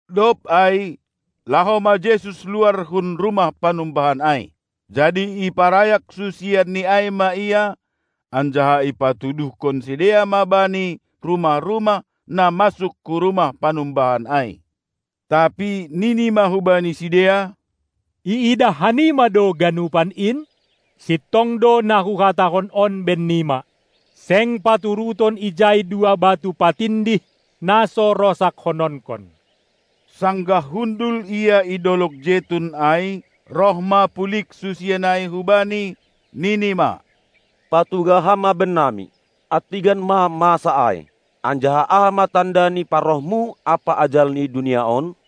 Dob ai laho ma Jesus luar hun rumah panumbahan ai. Jadi iparayak susianNi ai ma Ia, anjaha ipatuduhkon sidea ma Bani rumah-rumah na masuk hu rumah panumbahan ai. Tapi nini ma hubani sidea: Iidah hanima do ganupan in? Sintong do na Huhatahon on bennima: Seng paturuton ijai dua batu patindih na so rosakkononkon. Sanggah hundul Ia i dolog Jetun ai, roh ma pulig susian ai hu Bani, nini ma: Patugah Ham ma bennami, antigan ma masa ai, anjaha aha ma tanda ni parohMu ampa ajal ni dunia on?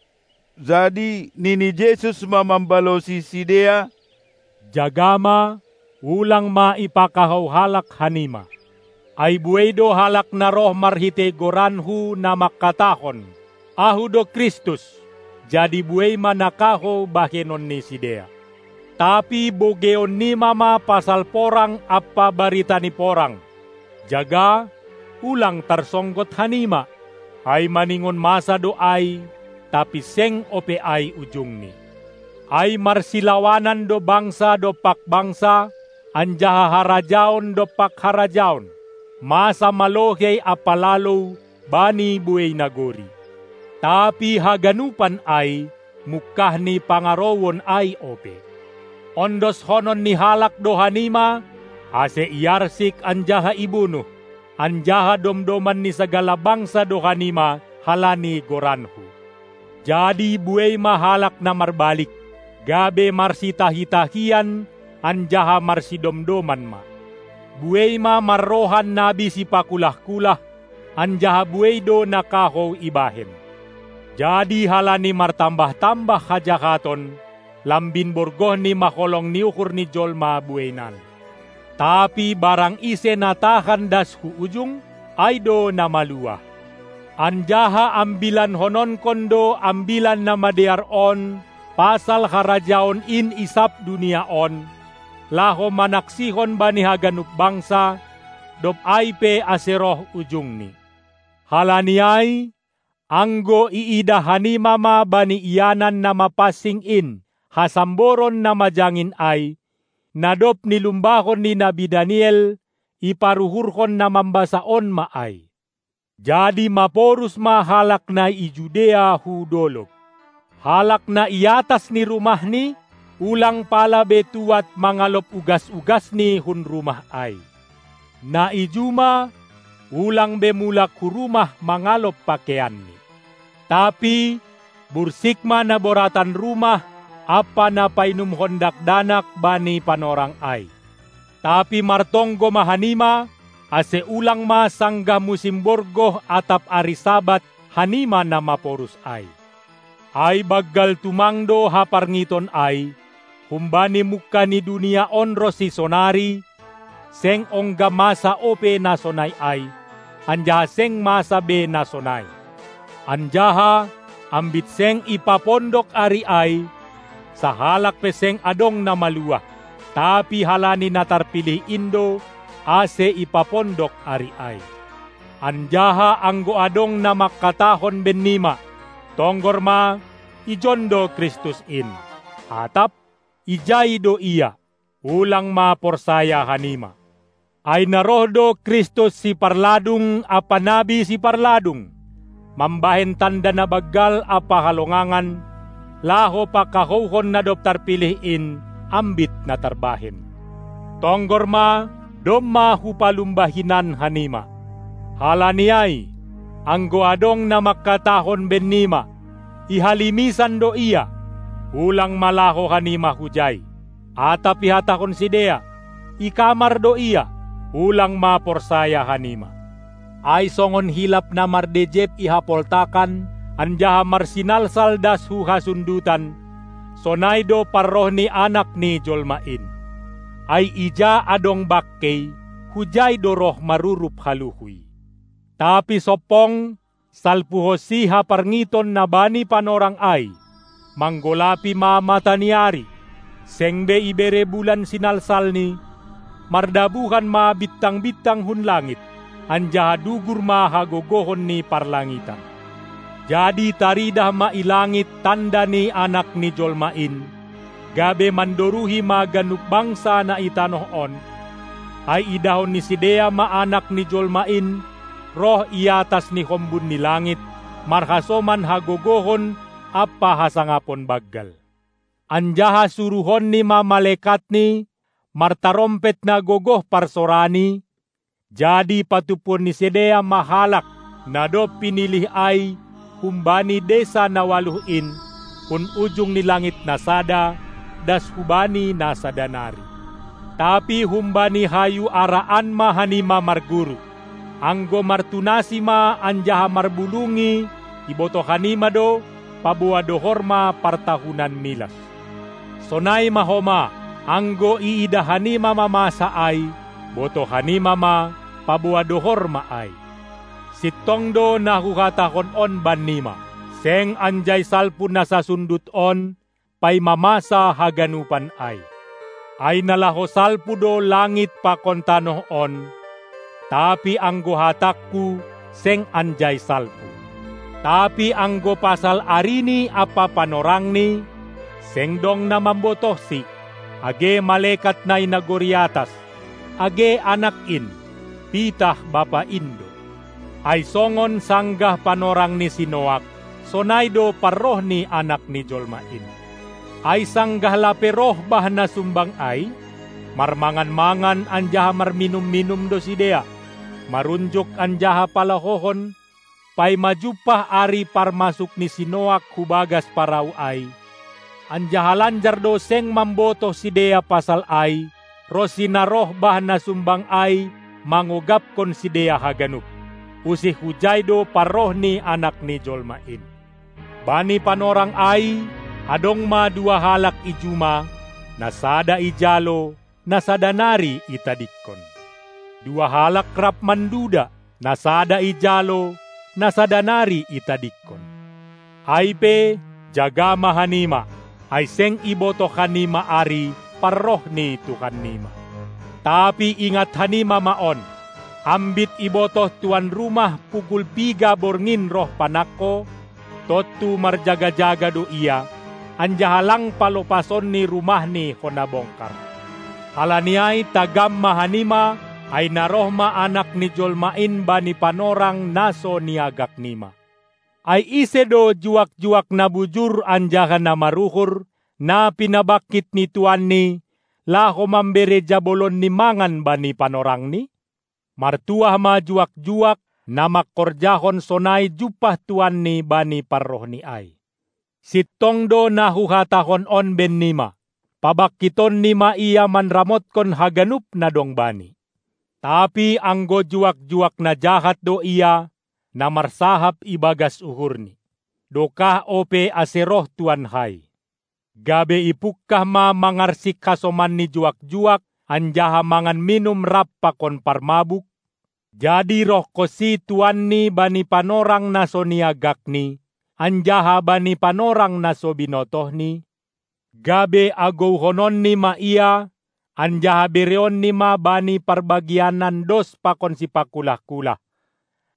Jadi nini Jesus ma mambalosi sidea: Jaga ma, ulang ma ipakahou halak hanima! Ai buei do halak na roh marhitei goranKu, na mangkatahon: "Ahu do Kristus" jadi buei ma na kahou bahenon ni sidea. Tapi bogeionnima ma pasal porang ampa barita ni porang. Jaga, ulang tarsonggot hanima, ai maningon masa do ai, tapi seng ope ai ujungni. Ai marsilawanan do bangsa dompak bangsa, anjaha harajaon dompak harajaon, masa ma lohei ampa lalou bani buei nagori. Tapi haganupan ai mungkah ni pangarouon ai ope. Ondoskonon ni halak do hanima, ase iarsik anjaha ibunuh; anjaha domdoman ni sagala bangsa do hanima halani goranKu. Jadi buei ma halak na marbalik, gabe marsitahi-tahian anjaha marsidomdoman ma. Buei ma marrohan nabi sipakulah-kulah, anjaha buei do na kahou ibahen. Jadi halani martambah-tambah hajahaton, lambin borgohni ma holong ni uhur ni jolma bueinan. Tapi barang ise na tahan das hu ujung, ai do na maluah. Anjaha ambilankononkon do Ambilan Namadear on pasal Harajaon in i sab dunia on, laho manaksihon bani haganup bangsa, dob ai pe ase roh ujungni. Halani ai, anggo iidah hanima ma bani ianan na mapansing in hasamboron na majangin ai, na dob nilumbahon ni nabi Daniel (iparuhurhon na mambasa on ma ai), jadi maporus ma halak na i Judea hu dolog. Halak na i atas ni rumahni, ulang pala be tuad mangalop ugas-ugasni hun rumah ai. Na i juma ulang be mulak hu rumah mangalop pakeianni. Tapi bursik ma na boratan rumah ampa na painumhon dakdanak bani panorang ai. Tapi martonggo ma hanima ase ulang ma sanggah musim borgoh atap ari Sabat hanima na maporus ai. Ai banggal tumang do haparngiton ai, humbani mungkah ni dunia on ronsi sonari seng ongga masa ope na sonai ai, anjaha seng masa be na sonai. Anjaha, ambit seng ipapondok ari ai, sahalak pe seng adong na maluah. Tapi halani na tarpilih in do, ase ipapondok ari ai. Anjaha anggo adong na mangkatahon bennima: "Tonggor ma, ijon do Kristus in", atap: "Ijai do Ia," ulang ma porsaya hanima. Ai na roh do Kristus siparladung ampa nabi siparladung, mambahen tanda na banggal ampa halongangan, laho pakahouhon na dob tarpilih in, ambit na tarbahen. Tonggor ma, domma Hupalumba hinan hanima. Halani ai, anggo adong na mangkatahon bennima: "I halimisan do Ia," ulang ma laho hanima hujai. Atap ihatahon sidea: "I kamar do Ia," ulang ma porsaya hanima! Ai songon hilap na mardejeb i hapoltakan anjaha marsinalsal das hu hasundutan, sonai do parroh ni Anak ni Jolma in. Ai ija adong bangkei, hujai do roh marurup haluhuy. Tapi sompong, salpuhonsi haparngiton na bani panorang ai, manggolapi ma mata ni ari, seng be ibere bulan sinalsalni, mardabuhan ma bintang-bintang hun langit, anjaha dugur ma hagogohon ni parlangitan. Jadi taridah ma i langit tanda ni Anak ni Jolma in, gabe mandoruhi ma ganup bangsa na i tanoh on, ai idahon ni sidea ma Anak ni Jolma in roh i atas ni hombun ni langit, marhasoman hagogohon ampa hasangapon banggal. Anjaha suruhonNi ma malekatNi martarompet na gogoh parsorani, jadi patumpuon ni sidea ma halak na dob pinilih ai humbani desa na ualuh in, hun ujung ni langit na sada das hubani na sada nari. Tapi humbani hayu ara an ma hanima marguru: Anggo martunasi ma anjaha marbulungi ibotoh hanima do, paboa dohor ma partahunan milas. Sonai ma homa, anggo iidah hanima ma masa ai, botoh hanima ma, paboa dohor ma ai. Sintong do na Huhatahon on bannima: Seng anjai salpu na sasundut on paima masa haganupan ai. Ai na laho salpu do langit pakon tanoh on, tapi anggo hatangKu seng anjai salpu. Tapi anggo pasal arini ampa panorangni, seng dong na mambotohsi, age malekat na i nagori atas, age Anak in; pitah Bapa in do. Ai songon sanggah panorang ni si Noak, sonai do parroh ni Anak ni Jolma in. Ai sanggah lape roh bah na sumbang ai, marmangan-mangan anjaha marminum-minum do sidea, marunjuk anjaha palahohon, paima jumpah ari parmasuk ni si Noak hu bagas parau ai, anjaha lanjar do seng mambotoh sidea pasal ai, ronsi na roh bah na sumbang ai mangogapkon sidea haganup. Usih hujai do parroh ni Anak ni jolma in. Bani panorang ai adong ma dua halak i juma, na sada ijalo, na sada nari itadingkon. Dua halak rap manduda, na sada ijalo, na sada nari itadingkon. Ai pe, jaga ma hanima, ai seng ibotoh hanima ari parroh ni Tuhannima! Tapi ingat hanima ma on: Ambit ibotoh tuan rumah pukul piga borngin roh panangko, tontu marjaga-jaga do ia, anjaha lang palopasonni rumahni hona bongkar. Halani ai tagam ma hanima, ai na roh ma Anak ni jolma in bani panorang na so niagaknima. Ai ise do juak-juak na bujur anjaha na maruhur, na pinabangkit ni tuanni, laho mambere jabolonni mangan bani panorangni? Martuah ma juak-juak, na mangkorjahon sonai jumpah tuanni bani parrohni ai. Sintong do na Huhatahon on bennima: Pabangkitonni ma ia manramotkon haganup na dong bani. Tapi anggo juak-juak na jahat do ia, na marsahap ibagas uhurni: "Dokah ope ase roh tuankai", gabe ipungkah ma mangarsik hasomanni juak-juak anjaha mangan minum rap pakon parmabuk, jadi rohkonsi tuanni bani panorang na so niagakni, anjaha bani panorang na so binotohni, gabe agouhononni ma ia, anjaha bereonni ma bani parbagianan dos pakon sipakulah-kulah.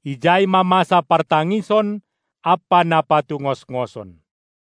Ijai ma masa partangison ampa na patungosngoson.